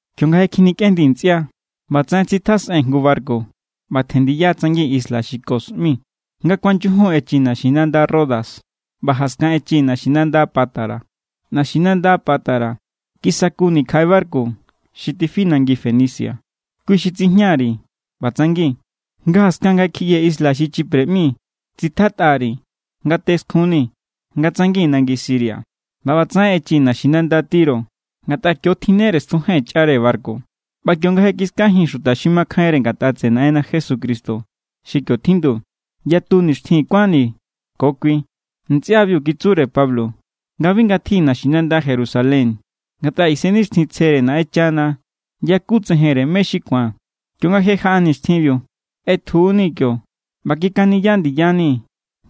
Kionga je kjinikꞌendii̱ ntsꞌia, ꞌbatsaꞌen tsitjasꞌee̱n jngu barku ꞌba tjen ndiya tsangi̱n isla xi Ko ꞌmi. Nga kuanyujun echii̱ naxinanda Rodas, ꞌba jaskan echii̱ naxinanda Pátara. Naxinanda Pátara kisakuni̱ kjaꞌe barku xi tifi nangi Fenicia, kui xi tsijña_ri̱ ꞌba tsangi̱n. Nga jaskan nga kjiꞌyee̱ isla xi Chipre ꞌmi, tsitjatꞌa_ri ngate skjunni̱ nga tsangi̱n nangi Siria. ꞌBa ꞌbatsaꞌen echii̱ naxinanda Tiro, ngatꞌa kio tjinnere stjujee̱n chꞌare barku. ꞌBa kionga je kiskajii̱n xuta xi makjainre ngatꞌa tseꞌe Naꞌenna Jesucristo xi kio tjindu, yatu nixtjin kuánni̱ ko kui. Ntsꞌiabiu kitsure Pablo nga bi ngatji naxinanda Jerusalén, ngatꞌa Isennixtjintsjere Naꞌenchana yakutsejenre mé= xi ku̱an. Kionga je jaꞌa nixtjinbiu, ꞌetjunii̱ kio ꞌba kikaniya ndiyani̱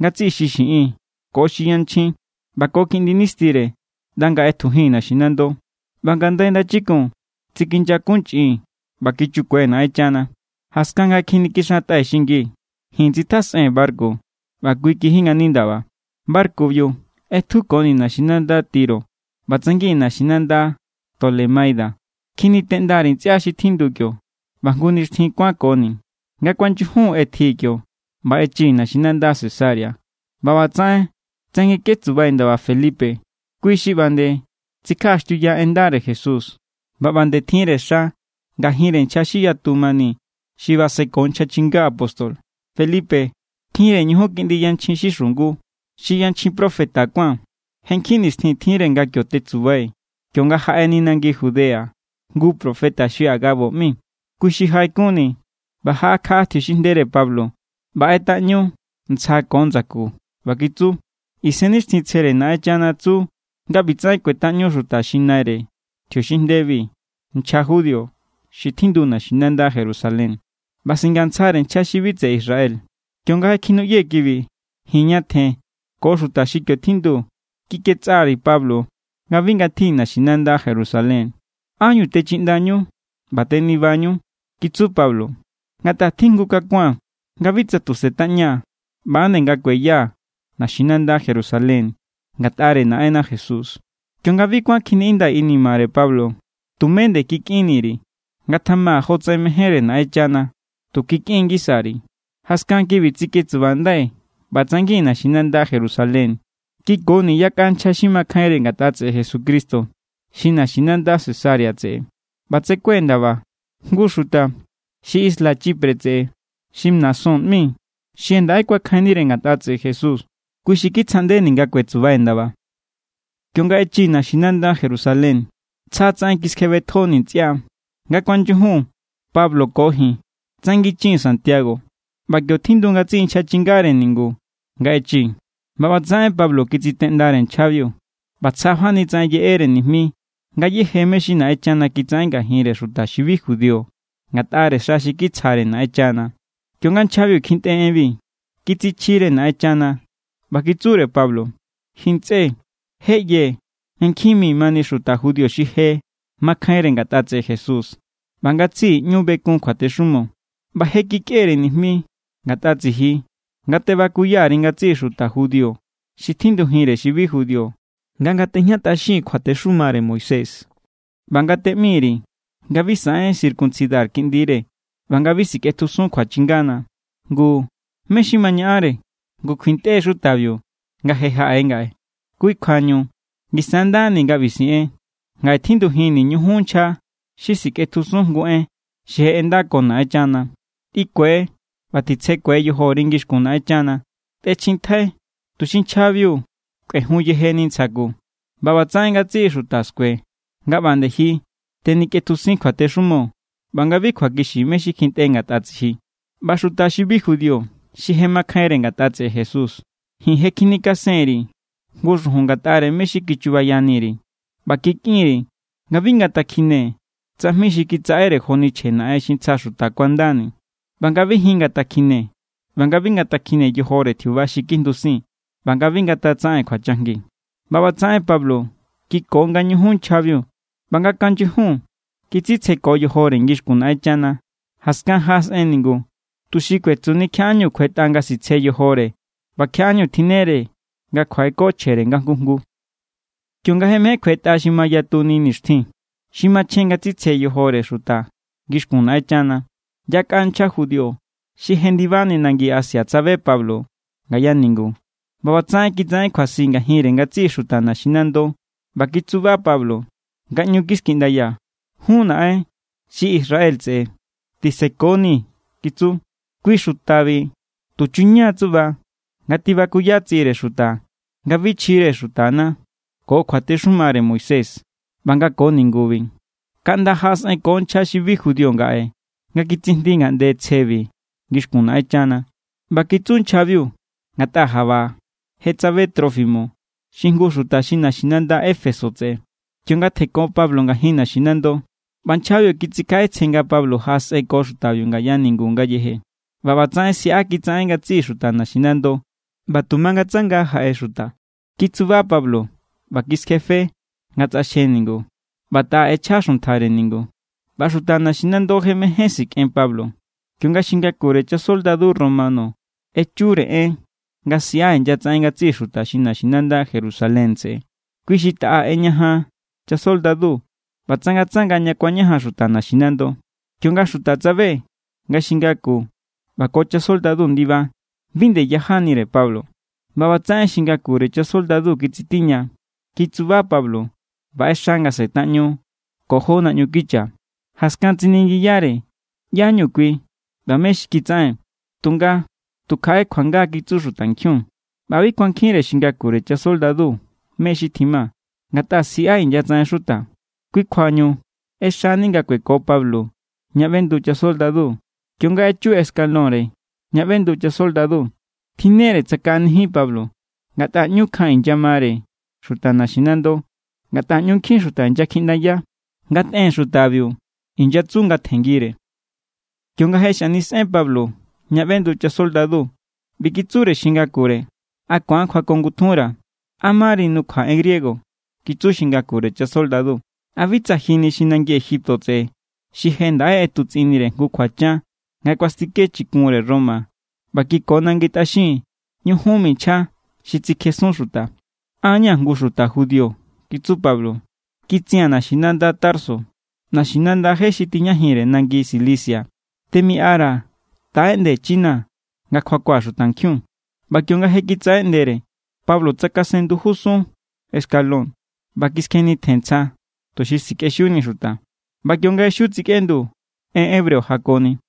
ngatsiꞌi xi xiꞌin ko xi yanchjin ꞌba ko kiꞌndi nistire ꞌnda nga ꞌetjujii̱n naxinando. ꞌBa ngandai ndachikun tsikinyakunchꞌii̱n ꞌba kichukue̱ Naꞌenchana. Jaskan nga je kjinikixantꞌai̱ xingii̱, ji̱n tsitjasꞌee̱n barku, ꞌba kui kiji ngani ndaba. Barkubiu ꞌetjukonii̱ naxinanda Tiro ꞌba tsangi̱n naxinanda Tolemaida. Kjiniteꞌnda_ri̱ ntsꞌia xi tjindu kio ꞌba jngu nixtjin kuankoni̱. Nga kuanyujun ꞌetjii̱ kio ꞌba echii̱ naxinanda Cesarea. ꞌBa ꞌbatsaꞌen tsanginketsubai̱ ndaba Felipe. Kui xi ꞌba nde tsikjaꞌaxtiuya en ndare Jesús, ꞌba ꞌba nde tjinre xa ngajinre nchja xi yatu mani xi baseko nchja chinga apóstol. Felipe tjinre ñujun kiꞌndi yanchjin xi xungu, xi yanchjin profeta kuán. Je nkjin nixtjin tjinre nga kio tetsubai̱ kionga jaꞌeni nangi Judea jngu profeta xi Agabo ꞌmi. Kui xi jaꞌekunni̱ ꞌba jaꞌakjaꞌa tjiuxinjndere Pablo ꞌba ꞌetꞌaꞌñu ntsja ko ndsaku ꞌba kitsu: —Isennixtjintsjere Naꞌenchana tsu nga ꞌbitsaꞌen kꞌuetꞌaꞌñu xuta xi naire tjiuxinjndebi nchja judío xi tjindu naxinanda Jerusalén. ꞌBa singantsjare nchja xi bi tseꞌe Israel. Kionga je kinuꞌyee̱ kibi, ji̱n ñatjen ko xuta xi kio tjindu kikꞌetsꞌa_ri̱ Pablo nga bi ngatji naxinanda Jerusalén. —¿Ánñu techiꞌndañu ꞌba tenibanu? —kitsu Pablo—. Ngatꞌa tjijngukakua̱n nga bi tsa tu setꞌaña̱, ꞌba=nde nga kueya naxinanda Jerusalén ngatꞌare Naꞌenna Jesús. Kionga bi kuán kjiniꞌindai̱ inimare Pablo, tumé nde kikꞌinni_ri̱. —Ngatjama jotsꞌen mejénre Naꞌenchana —tu kikꞌin ngisa_ri̱. Jaskan kibi tsiketsubandai̱ ꞌba tsangi̱n naxinanda Jerusalén. Kikoni yakꞌa nchja xi makjainre ngatꞌa tseꞌe Jesucristo xi naxinanda Cesarea tseꞌe. ꞌBa tsekue̱ ndaba jngu xuta xi isla Chipre tseꞌe xi Mnasón ꞌmi, xi je ndaꞌe kuakjainnire ngatꞌa tseꞌe Jesús. Kui xi kitsjaꞌndeni̱ nga kuetsubai̱ ndaba. Kionga echii̱ naxinanda Jerusalén, tsja tsaꞌen kiskjebetjoni̱ ntsꞌia. Nga kuanyujun Pablo ko ji̱n tsanginchii̱n Santiago. ꞌBa kio tjindu ngatsiꞌi nchja chingare ningu nga echii̱. ꞌBa ꞌbatsaꞌen Pablo kitsiteꞌndare nchjabiu ꞌba tsjafani tsaꞌen yeꞌere nijmi ngayéje mé= xi Naꞌenchana kitsaꞌen ngajinre xuta xi bi judío ngatꞌare xa xi kitsjare Naꞌenchana. Kionga nchjabiu kjintꞌe enbi, kitsichjire Naꞌenchana ꞌba kitsure Pablo: —Ji ntsꞌe, je ꞌyee̱ nga nkjin mi mani xuta judío xi je makjainre ngatꞌa tseꞌe Jesús, ꞌba ngatsiꞌi ꞌñu bekun kjuatexumo. ꞌBa je kikꞌere nijmi ngatꞌa tsiji nga tebakuya_ri ngatsiꞌi xuta judío xi tjindujinre xi bi judío nga ngatꞌejñatꞌaxin kjuatexumare Moisés, ꞌba nga teꞌmi_ri nga bi saꞌen circuncidar kiꞌndire ꞌba nga bi sikꞌetjusun kjuachingana. ’Ngu, ¿mé= xi ma ñaꞌanre? Ngu kjuintꞌe= xutabiu nga je jaꞌe ngaꞌe. Kui kjuañu ngisa= ndani nga ꞌbi siꞌen: Ngaꞌe tjindujinni̱ ñujun nchja xi sikꞌetjusun jngu en xi je ꞌendako Naꞌenchana. Tꞌikue ꞌba titsjekue yojori ngixkun Naꞌenchana. Tꞌechjintjai tuxi nchjabiu kꞌuejun yejeni ntsja ku. ꞌBatsaꞌen ngatsiꞌi xuta skue nga ꞌba nde ji tenikꞌetjusin kjuatexumo ꞌba nga bi kjuakixi mé= xi kjintꞌe ngatꞌa tsiji. ’ꞌBa xuta xi bi judío xi je makjainre ngatꞌa tseꞌe Jesús, ji̱n je kjinikasen_ri̱ jngu xujun ngatꞌare mé= xi kichubayani_ri̱. ꞌBa kikꞌin_ri̱ nga bi ngatakjine tsajmi xi kitsaꞌere joni chje naꞌen xi ntsja xuta kuandani, ꞌba nga bi jin ngatakjine ꞌba nga bi ngakjine yojore tjiuba xi kjindusin, ꞌba nga bi ngatatsaꞌen kjuachajngi. ꞌBa ꞌbatsaꞌen Pablo kiko ngañujun nchjabiu ꞌba nga kuanyujun kitsitsjeko yojore ngixkun Naꞌenchana. Jaskan jaꞌasꞌen ningu tuxi kuetsuni kjiaꞌá=ñu kjuetꞌa nga sitsje yojore ꞌba kjiaꞌá=ñu tjinnere nga kjuaꞌeko chjere nga jngu jngu. Kionga je mején kjuetꞌa xi mayatuni nixtjin xi machjen nga tsitsje yojore xuta ngixkun Naꞌenchana, yakꞌa nchja judío xi jendibani nangi Asia tsabe Pablo ngaya ningu. ꞌBa ꞌbatsaꞌen kitsaꞌen kjuasi ngajinre ngatsiꞌi xuta naxinando ꞌba kitsuba Pablo nga ꞌñu kiskiꞌndaya: —¡Jún naꞌen xi Israel tseꞌe, tisekonii̱! —kitsu—. Kui xutabi tuchuña tsuꞌba nga tibakuya tsiꞌire xuta nga bi chjire xutana ko kjuatexumare Moisés ꞌba ko ningubi. Kaꞌnda jaꞌasꞌenko nchja xi bi judío ngaꞌe nga kitsijndi ngaꞌnde tsjebi ngixkun Naꞌenchana. ꞌBa kitsu nchjabiu ngatꞌa jaꞌba je tsabe Trófimo, xi jngu xuta xi naxinanda Éfeso tseꞌe, kionga tjenko Pablo ngajin naxinando. ꞌBa nchjabiu kitsikjaꞌetsjen nga Pablo jaꞌasꞌenko xutabiu ngaya ningu ngayeje. ꞌBa ꞌbatsaꞌen siꞌa kitsaꞌen ngatsiꞌi xuta naxinando ꞌba tu mangatsanga jaꞌe xuta. Kitsuba Pablo ꞌba kiskjefe nga tsꞌaxje ningu ꞌba taꞌa ꞌechja xuntjare ningu. ꞌBa xuta naxinando je mején sikꞌen Pablo, kionga xi ngakure chasoldadu romano echure en nga siꞌa inyatsaꞌen ngatsiꞌi xuta xi naxinanda Jerusalén tseꞌe. Kui xi taꞌa ꞌeñajan chasoldadu ꞌba tsangatsanga ña kuañajan xuta naxinando. Kionga xuta tsabe nga xi ngaku ꞌba ko chasoldadu ndiba, bi nde yajanire Pablo. ꞌBa ꞌbatsaꞌen xi ngakure chasoldadu kitsitiña, kitsuba Pablo ꞌba ꞌexa nga setaꞌñu ko jó naꞌñu kicha. Jaskan tsiningiyare ꞌyáñu kui ꞌba mé= xi kitsaꞌen. Tunga tu kjaꞌe kjuanga kitsu xutankjiun, ꞌba bi kuankjinre xi ngakure chasoldadu mé= xi tjima, ngatꞌa siꞌa inyatsaꞌen xuta. Kui kjuañu ꞌexani nga kueko Pablo ña ꞌbendu chasoldadu. Kionga echu escalónre ña ꞌbendu chasoldadu, tjinnere tsakaꞌanijin Pablo, ngatꞌa ꞌñu kjan inyamare xuta naxinando. Ngatꞌa ꞌñu nkjin xuta inyakjiꞌndaya: —¡Ngatꞌen xutabiu! —inyatsu nga tjenngire. Kionga je xanisꞌen Pablo ña ꞌbendu chasoldadu, ꞌbi kitsure xi ngakure: —¿A ku̱an kjuakongutjunra̱? —¿A mari nukjua en griego? —kitsu xi ngakure chasoldadu—. ¿A bi tsa ji ni xi nangi Egipto tseꞌe xi je ndaꞌe ꞌetutsꞌinnire jngu kjuachan nga kuastike chikunre Roma ꞌba kiko nangi tꞌaxin ñujun mi nchja xi tsikjesun xuta? —An= ña̱ jngu xuta judío —kitsu Pablo—. Kitsia̱n naxinanda Tarso, naxinanda je xi tijñajinre nangi Cilicia. Temiꞌara̱, taꞌeꞌndechinaa̱ nga kjuakua̱ xutankjiun. ꞌBa kionga je kitsaꞌeꞌndere, Pablo tsakasen ndujusun escalón ꞌba kiskjenitjen ntsja tuxi sikꞌexiuni xuta. ꞌBa kionga je xiu tsikꞌendu, en hebreo jakoni.